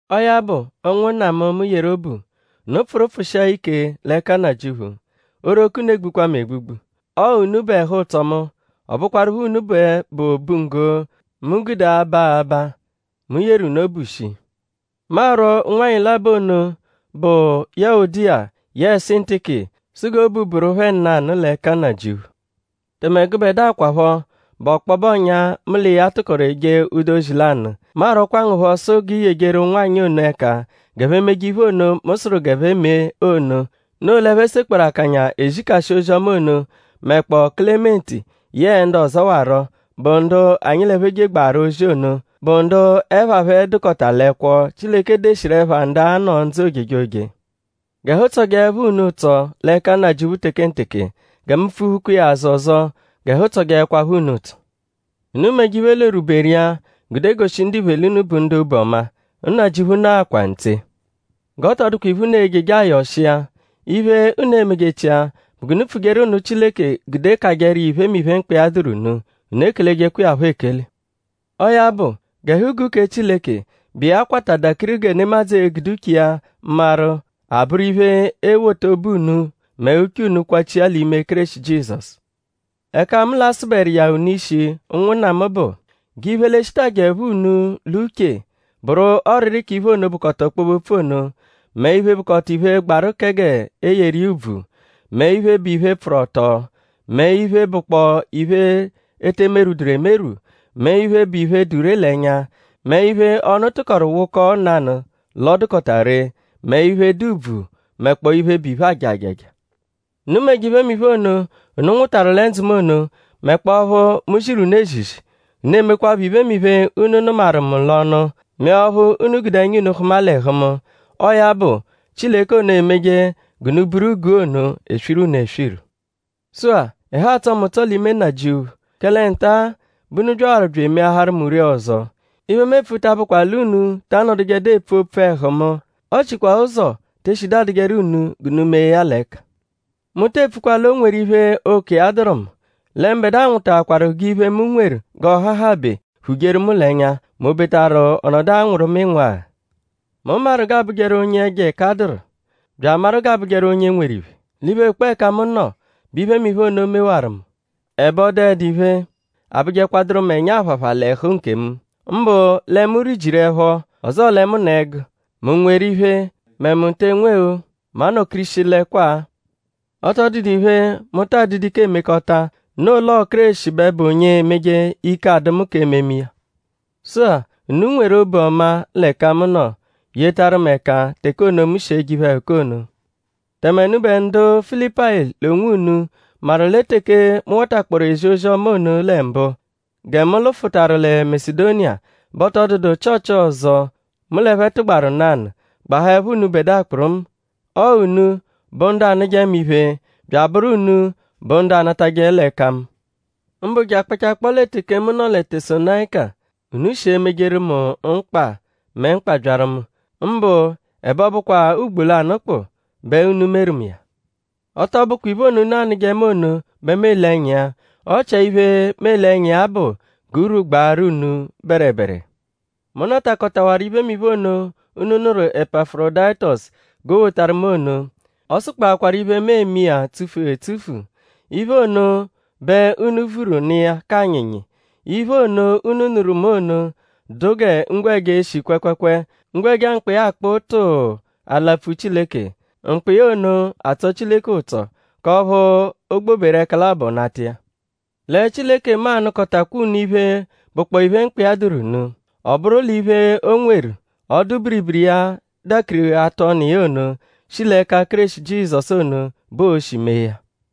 Ọo ya bụ; ụnwunna mu, mu yeru obu; unu pfụru pfụshia ike l'ẹka Nnajịuphu. Oghoroko unu egbukwa mu egbugbu. Ọo unu bụ ẹhu-ụtso mu; ọ bụkwarupho unu bẹ bụ obunggo, mu e-gude aba abaa. Mu yeru unu obu shii. Mu arwọ ụnwanyi labọ ono, bụ Yuwodiya yẹe Sintiki sụ g'obu bụru phẹ nanụ l'ẹka Nnajịuphu. Tẹme gụbedua kwaphọ, bụ ọkpobe ọ̀nyà; mu l'iya tụkoru eje ụdu ozi lanụ; mu arwọkwa ngu phọ sụ g'i yejeru ụnwanyi ono ẹka g'ẹphe meje iphe ono, mu sụru g'ẹphe me ono; noo l'ẹphe sekpọoru akanya ezikashi ozi-ọma ono; mẹkpoo Kelementi yẹe ndu ọzowaro, bụ ndu anyi l'ẹphe jegbaru ozi ono; bụ ndu ẹpha phẹ dụkota l'ẹkwo, Chileke deshiru ẹpha ndu a-nọ ndzụ ojejoje. G'ẹhu tsọjeepho unu ụtso l'ẹka Nnajịuphu tekenteke. Gẹ mu pfuphukwa iya azụ ọzo; g'ẹhu tsọjeekwapho unu ụtso. Unu meje iphe l'orwuberu iya gude goshije ndiphe l'unu bụ ndu obu ọma. Nnajịuphu nọakwa ntse. G'ọ tọ dụkwa iphe, unu e-jeje ayọ ọshi iya. Iphe, unu e-mejechia bụ g'unu pfujeru nụ Chileke gude kajẹru iya iphemiphe, mkpa iya dụru unu; unu ekelejekwa iya phọ ekele. Ọo ya bụ; g'ẹhu-guu kẹ Chileke, bụ iya kwata dakiri gẹ nemadzụ e-gude uche iya maru; abụru iphe, e-wota obu unu mẹ uche unu kwachia l'ime Kéreshi Jizọsu. Ẹka mu l'a-sụberu iya unu ishi ụnwunna mu bụ; g'iphe, l'e-shitajẹepho unu l'uche bụru ọriri k'iphe ono, bụkota ọkpobe-opfu ono; mẹ iphe, bụkpoo iphe, gbaru kẹ g'e yeru iya ùbvù; mẹ iphe, bụ iphe, pfụru ọto; mẹ iphe, bụkpoo iphe, e te merwuduru emerwụ; mẹ iphe, bụ iphe, dụ ree l'ẹnya; mẹ iphe, ọnu tụkoru wụkoo nanụ l'ọ dụkota ree; mẹ iphe, dụ ùbvù; mẹkpoo iphe, bụ iphe, aaja ajaja. Unu meje iphemiphe ono, unu nwụtaru lẹ ndzụ mu ono; mẹkpoo ọphu mu ziru unu ezizi; unu emekwaphọ iphemiphe, unu nụmaru mu l'ọnu; mẹ ọphu unu gude ẹnya unu hụma l'ẹhu mu. Ọo ya bụ; Chileke ono, emeje g'unu buru guu ono eswiru unu eswiru. Sụ-a; ẹhu atsọ mu ụtso l'ime Nnajịuphu; kẹle nta-a bẹ unu byawaru bya emeaharu mu ree ọzo. Iphe, mu epfu ta abụkwa l'unu ta anọdujedu epfu opfu ẹhu mu; ọ chikwa ụzo te eshidu adụjeru unu g'unu mee ya l'ẹka. Mu te epfukwa l'o nweru iphe, ụko iya dụru mu; lẹ mbẹdua nwụtaakwaru g'iphe, mu nweru g'ọ hahabẹ phujeru mu l'ẹnya; m'obetaru ọ nọdu anwụru mu ịnwuagha. Mu maru g'a bụjeru onye ẹjo ẹka dụru; bya amaru g'a bụjeru onye nweru iphe. L'iphe, bụkpoo ẹka mu nọ bẹ iphemiphe ono mewaru mu; ẹbe ọ dụedu iphe, abụjekwaduru mu ẹnya-aphapha l'ẹhu nkemu; mbụ lẹ mu rijiru ẹpho; ọzoo lẹ mu nọ ẹgu;?mu nweru iphe; mẹ mu te enwe-o; mu anọ-kirishilẹkwaa. Ọ tọ dụdu iphe, mu ta adụdu ike emekọta; noo l'ọo Kéreshi bẹ bụ onye emeje ike adụ mu k'ememe iya. Sụ-a; unu nweru obu ọma l'ẹka mu nọ; yetarụ mu ẹka teke ono, mu shi eje iphe-ẹhuka ono. Tẹme unubẹ ndu Filipayi l'onwunu maru lẹ teke mu watakpọoru ezi ozi-ọma ono lẹ mbụ; gẹ mu lụfutaru lẹ Masedoniya bẹ ọ tọ dụdu Chịochi ọzo, mu l'ẹphe tụgbaru nanụ; gbahaẹpho unubẹdua kpụrumu: ọo unu bụ ndu anụje mu iphe bya abụru unu bụ ndu anatajẹ l'ẹka mu. Mbụ je akpachakpọo lẹ teke mu nọ lẹ Tesalonayika; unu shi emejeru mu mkpa; mẹ mkpa byaru mu; mbụ ẹbe ọ bụkwaa ugbo lanụ kpụu bẹ unu meru mu iya. Ọ tọ bụkwa iphe ono, unu anụje mu ono bẹ mu ele ẹnya iya; ọ chia iphe, mu ele ẹnya iya bụ g'urwu gbaaru unu bẹrebere. Mu natakọtawaru iphemiphe ono, unu nụru Epafurodayitosu g'o wotaru mu ono. Ọo-sụkpokwaaru iphe, mu eme iya tsufu etsufu. Iphe ono bẹ unu vuru nụ iya k'anyịnyi. Iphe ono, unu nụru mu ono dụ gẹ ngwẹja, eshi kwẹekweekwee; ngwẹja, mkpọ iya akpụ tụuu alapfu Chileke. Mkpọ iya ono atsọ Chileke ụtso; k'ọphu o gboberu ẹka labọ nata iya. Lẹ Chileke mu a-nụkotakwaa unu iphe, bụkpoo iphe, mkpa iya dụru unu. Ọ bụru l'iphe o nweru, ọdu-biribiri iya dakiri atụ ọnu iya ono, shi l'ẹka Kéreshi Jizọsu ono bẹ o-shi mee ya.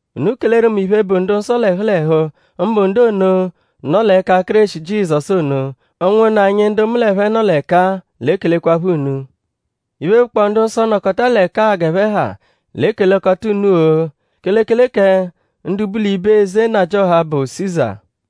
Unu keleru mu iphe, bụ ndu-nsọ l'ẹhu l'ẹhu; mbụ ndu ono, nọ l'ẹka Kéreshi Jizọsu ono. Ụnwunna anyi ndu mu l'ẹphe nọ l'ẹka-a l'ekelekwaphọ unu. Iphe, bụkpoo ndu-nsọ, nọkota l'ẹka-a g'ẹphe ha l'ekelekọta unu-o; kelekele kẹ ndu bu l'ibe eze nnajịoha, bụ Siza.